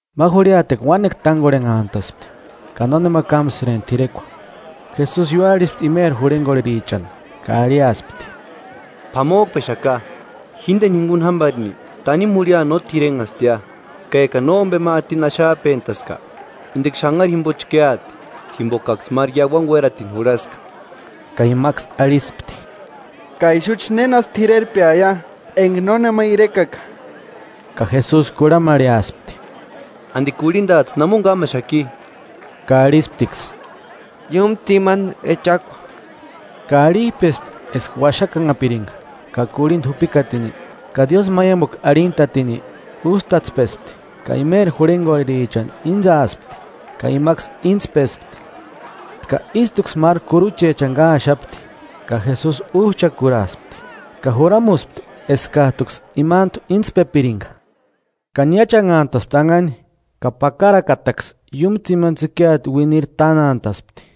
Ma jurhiatekua uánekua tángorhenhantaspti ka nónema kámsïrempti t'irekua. Jesusi ióarhispti imeri jurhengorherichani ka arhiaspti: 2–P'amojkpexaka, jíndeni jinguni jámbarini tanimu jurhia no t'irenhastia. Ka ekani nómbema atini axajpentaska, indeksï xanhari jimbo chkéati, jimbokaksï máru iauani uératini jurhaska. Ka imaksï arhispti: –¿Ka ixuchi nénasï t'irerpeaia, enga nónema irekaka? Ka Jesusi kurhamarheaspti: –¿Andi kurhindajtsï namoni kámaxaki? Ka arhisptiksï: –Iúmu tsimani echakua. Ka arhijpespti eska uaxakanhapiringa, ka kurhinda jupikatini, ka diósïmaiamukua arhintatini, ústatspespti ka imeri jurhengorherichani íntsaaspti, ka imaksï íntspespti. Ka ístuksï máru kuruchechani káaxapti, ka Jesusi újchakuraaspti, ka juramuspti eskajtuksï imantu intspepiringa. Ka niáchanhantaspti anhani, ka pakarakataksï iúmu tsimani tsïkiata uiniri tánantaspti.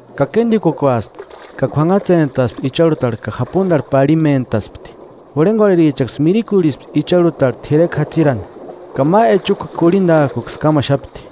Ka kéndikukuaspti ka k'uanhatsentaspti icharhutarhu ka japundarhu parhimentaspti. Jurhengorherichaksï mirikurhispti icharhutarhu t'irekua jatsirani, ka ma echukua kurhindajkuksï kámaxapti.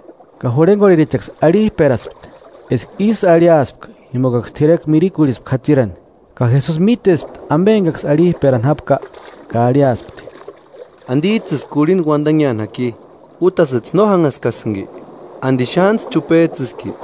Ka jurhengorherichaksï arhijperaspti eska ísï arhiaspka jimbokaksï t'irekua mirikurhispka jatsirani. Ka Jesusi mítespti ambe engaksï arhijperani jápka ka arhiaspti: –¿Andijtsïsï kurhinda uandanheani jaki? ¿Útasïjtsï no jánhaskasïnki? ¿Andi xántsï chupejtsïski?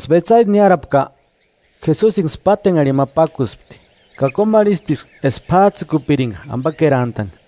Engaksï Betsaida niárapka, Jesusiniksï pátenharhini ma pákuspti, ka kómarhisptiksï eska p'ájtsïkupiringa ambakerantani.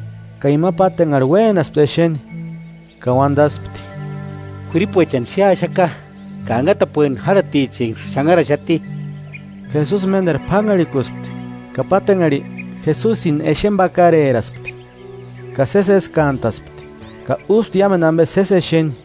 Ka ima pátenharhi uénaspti exeni, ka uandaspti: –K'uiripuechani xéaxaka, anhatapueni járhatichenksï xanharaxati. Jesusi ménderu p'ánharhikuspti, ka pátenharhi, Jesusini exeni pakareraspti, ka sési eskantaspti, ka úspti iámendu ambe sési exeni.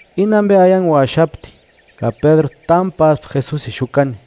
Íni ambe aianguaxapti. Ka Pédru támu páspti Jesusini xukani.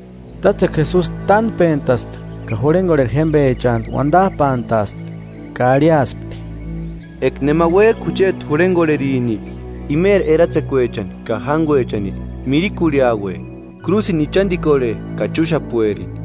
Tátsekua Jesusi tánpentaspti ka jurhengorheri jémbechantu uandajpantaaspti, ka arhiaspti: –Eka nema uéjka jucheti jurhengorherini, imeri eratsekuechani ka jánguechani mirikurhiaue, krúsini ichandikorhe ka chúxapuerini.